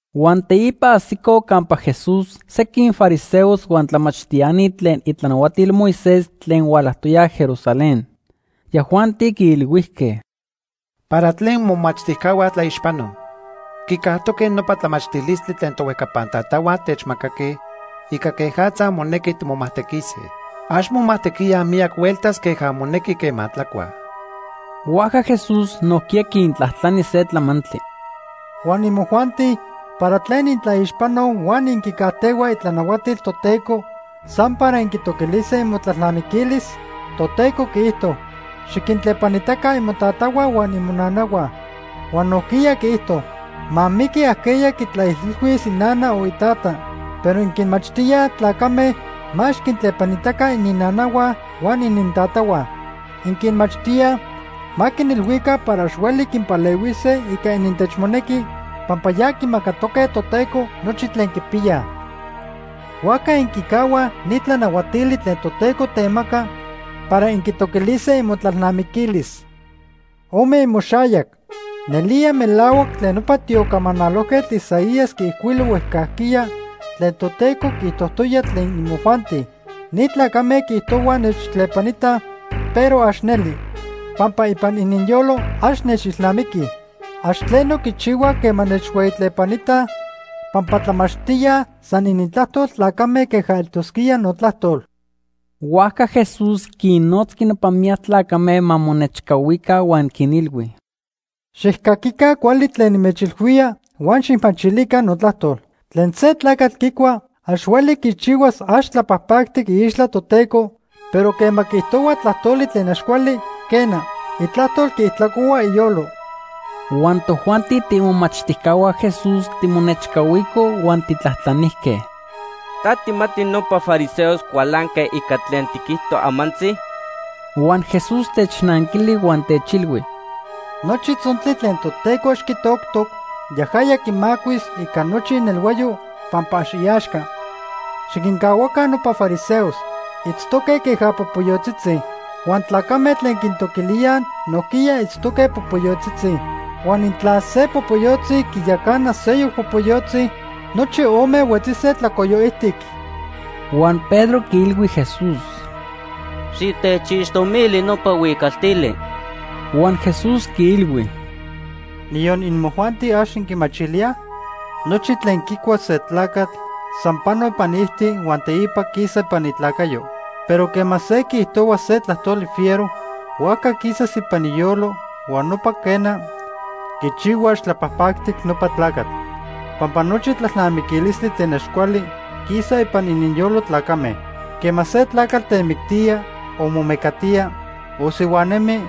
Huan teipa ajsicoj campa Jesús sequin fariseos huan tlamachtiani tlen itlanahuatil Moisés tlen hualajtoyaj Jerusalén. Yajuanti quiilhuijque: ―¿Para tlen momachtijcahua tlaixpanoj? Quicajtoque nopa tlamachtilistli tlen tohuejcapan tatahua techmacaque ica quejatza monequi timomajtequise. Ax momajtequíaj miyac hueltas queja monequi quema tlacuaj. Huajca Jesús nojquiya quintlajtlani se tlamantli: ―Huan imojuanti ¿para tlen intlaixpanoj huan inquicajtehuaj itlanahuatil Toteco san para inquitoquilise imotlalnamiquilis? Toteco quiijto: ‘Xiquintlepanitaca imotatahua huan imonanahua.’ Huan nojquiya quiijto: ‘Ma miqui ajqueya quitlaijilhuía inana o itata.’ Pero inquinmachtíaj tlacame ma ax quintlepanitaca ininnanahua huan inintatahua. Inquinmachtíaj ma quinilhuica para ax hueli quinpalehuise ica inintechmonequi pampa ya quimacatoque Toteco nochi tlen quipiyaj. Huajca inquicahuaj ni tlanahuatili tlen Toteco temacac para inquitoquilise imotlalnamiquilis. Ome imoxayac. Nelía melahuac tlen nopa tiocamanalojquetl Isaías quiijcuilo huejcajquiya tlen Toteco quiijtojtoya tlen imojuanti: ‘Ni tlacame quiijtohuaj nechtlepanitaj, pero ax neli, pampa ipan ininyolo ax nechilnamiquij. Ax tleno quichihuaj quema nechhueyitlepanitaj, pampa tlamachtíaj san inintlajtol tlacame queja eltosquía notlajtol.’ Huajca Jesús quinnotzqui nopa miyac tlacame ma monechcahuica huan quinilhui: ―Xijcaquica cuali tlen nimechilhuía huan xijmachilica notlajtol. Tlen se tlacatl quicua ax hueli quichihuas ax tlapajpactic iixtla Toteco, pero quema quiijtohua tlajtoli tlen ax cuali, quena, itlajtol quiijtlacohua iyolo. Huan tojuanti tiimomachtijcahua Jesús timonechcahuicoj huan tijtlajtlanijque: ―¿Ta tijmati nopa fariseos cualanque ica tlen tiquijto amantzi? Huan Jesús technanquili huan techilhui: ―Nochi tzontli tlen Toteco ax quitoctoc, yajaya quimacuis ica nochi inelhuayo pampa ax iaxca. Xiquincahuaca nopa fariseos. Itztoque queja popoyotzitzi. Huan tlacame tlen quintoquilíaj nojquiya itztoque popoyotzitzi. Huan intla se popoyotzi quiyacana seyoc popoyotzi, nochi ome huetzise tlacoyo ijtic. Huan Pedro quiilhui Jesús: ―Xitechixtomili nopa huicaltili. Huan Jesús quiilhui: ―¿Niyon imojuanti, ax inquimachilíaj? Nochi tlen quicua se tlacatl san pano ipan iijti huan teipa quisa ipan itlacayo. Pero quema se quiijtohua se tlajtoli fiero, huajca quisas ipan iyolo huan nopa, quena, quichihua ax tlapajpajtic nopa tlacatl. Pampa nochi tlalnamiquilistli tlen ax cuali quisa ipan ininyolo tlacame. Quema se tlacatl temictía, o momecatía, o sihuanemi,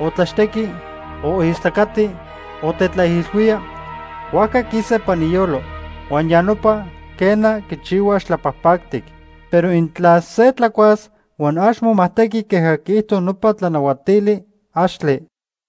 o tlaxtequi, o istlacati, o tetlaijilhuía, huajca quisa ipan iyolo. Huan ya nopa, quena, quichihua ax tlapajpactic. Pero intla se tlacuas huan ax momajtequi queja quiijto nopa tlanahuatili, axtle.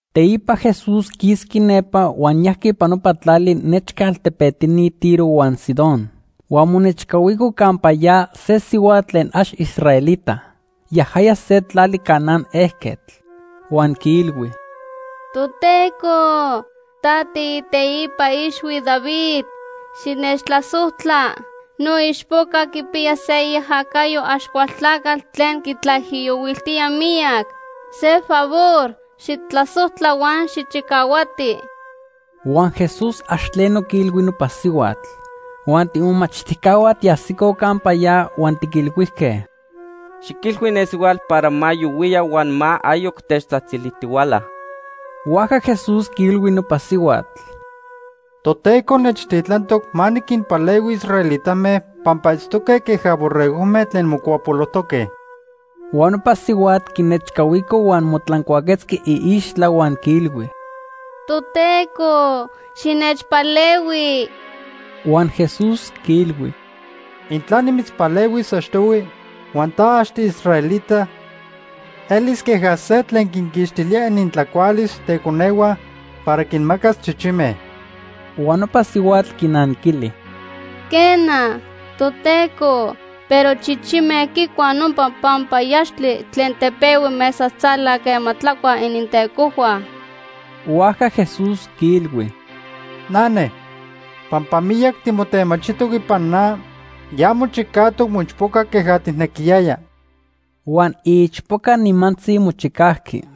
Teipa Jesús quisqui nepa huan yajqui ipan nopa tlali nechca altepetini Tiro huan Sidón. Huan monechcahuico campa ya se sihuatl tlen ax israelita. Yajaya se tlali Canaán ejquetl. Huan quiilhui: ―Toteco, ta tiiteipa ixhui David, xinechtlasojtla. Noichpoca quipiya se iajacayo Axcualtlacatl tlen quitlaijiyohuiltía miyac. Se favor xijtlasojtla huan xijchicahuati. Huan Jesús ax tleno quiilhui nopa sihuatl. Huan tiimomachtijcahua tiajsicoj campa ya huan tiquilhuijque: ―Xiquilhui ne sihuatl para ma yohuiya huan ma ayoc techtzajtzilijtihuala. Huajca Jesús quiilhui nopa sihuatl: ―Toteco nechtitlantoc ma niquinpalehui israelitame pampa itztoque queja borregojme tlen mocuapolojtoque. Huan nopa sihuatl quinechcahuico huan motlancuaquetzqui iixtla huan quiilhui: ―Toteco, xinechpalehui. Huan Jesús quiilhui: ―Intla nimitzpalehuis achtohui huan ta ax tiisraelita, elis queja se tlen quinquixtilía inintlacualis teconehua para quinmacas chichime. Huan nopa sihuatl quinanquili: ―Quena, Toteco, pero chichime quicuaj nopa panpayaxtli tlen tepehui mesatzala quema tlacuaj inintecohua. Huajca Jesús quiilhui: ―Nane, pampa miyac timotemachijtoc ipan na, ya mochicajtoc moichpoca queja tijnequiyaya. Huan iichpoca nimantzi mochicajqui.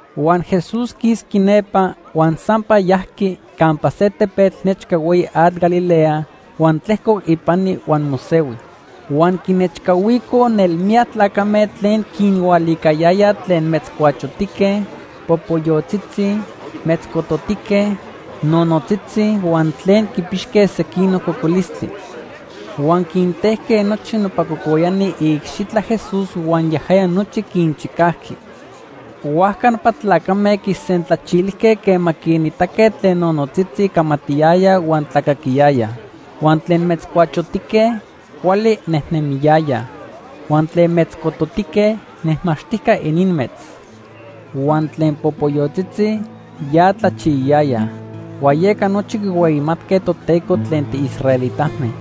Huan Jesús quisqui nepa, huan sampa yajqui campa se tepetl nechca hueyi atl Galilea huan tlejcoc ipani huan mosehui. Huan quinechcahuicoj nelmiyac tlacame tlen quinhualiquiliyayaj tlen metzcuachotique, popoyotzitzi, metzcototique, nonotzitzi, huan tlen quipixque sequinoc cocolistli. Huan quintejque nochi nopa cocoyani iicxitla Jesús huan yajaya nochi quinchicajqui. Huajca nopa tlacame quisentlachilijque quema quinitaque tlen nonotzitzi camatiyayaj huan tlacaquiyayaj. Huan tlen metzcuachotique, cuali nejnemiyayaj. Huan tlen metzcototique, nejmaxtijca ininmetz. Huan tlen popoyotzitzi, ya tlachiyayayaj. Huan yeca nochi quihueyimatque Toteco tlen tiisraelitame.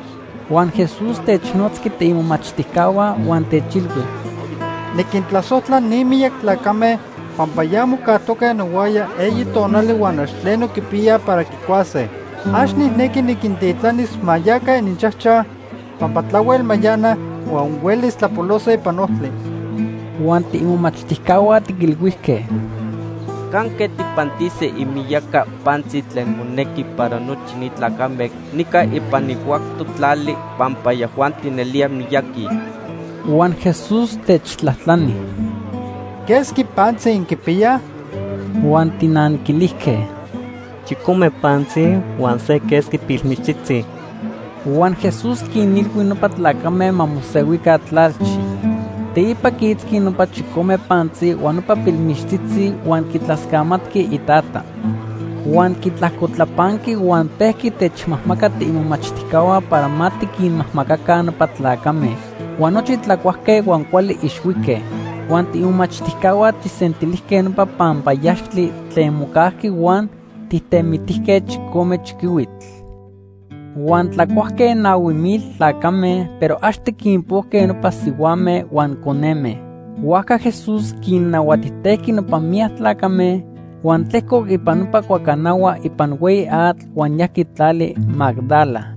Huan Jesús technotzqui tiimomachtijcahua huan techilhui: ―Niquintlasojtla ni miyac tlacame pampa ya mocajtoque nohuaya eyi tonali huan ax tleno quipiya para quicuase. Ax nijnequi niquintitlanis ma yaca ininchajchaj, pampa tlahuel mayanaj huan huelis tlapolose ipan ojtli. Huan tiimomachtijcahua tiquilhuijque: ―¿Canque tijpantise imiyaca pantzi tlen monequi para nochi ni tlacame nica ipan ni huactoc tlali pampa yajuanti nelía miyaqui? Huan Jesús techtlajtlani: ―¿Quesqui pantzi inquipiyaj? Huan tijnanquilijque: ―Chicome pantzi huan se quesqui pilmichtzitzi. Huan Jesús quinilhui nopa tlacame ma mosehuica tlalchi. Teipa quiitzqui nopa chicome pantzi huan nopa pilmichtzitzi huan quitlascamatqui Itata. Huan quitlajcotlapanqui huan pejqui techmajmaca tiimomachtijcahua para ma tiquinmajmacaca nopa tlacame. Huan nochi tlacuajque huan cuali ixhuique. Huan tiimomachtijcahua tijsentilijque nopa panpayaxtli tlen mocajqui huan tijtemitijque chicome chiquihuitl. Huan tlacuajque nahui mil tlacame, pero ax tiquinpojque nopa sihuame huan coneme. Huajca Jesús quinnahuatijtejqui nopa miyac tlacame, huan tlejcoc ipan nopa cuacanahua ipan hueyi atl huan yajqui tlali Magdala.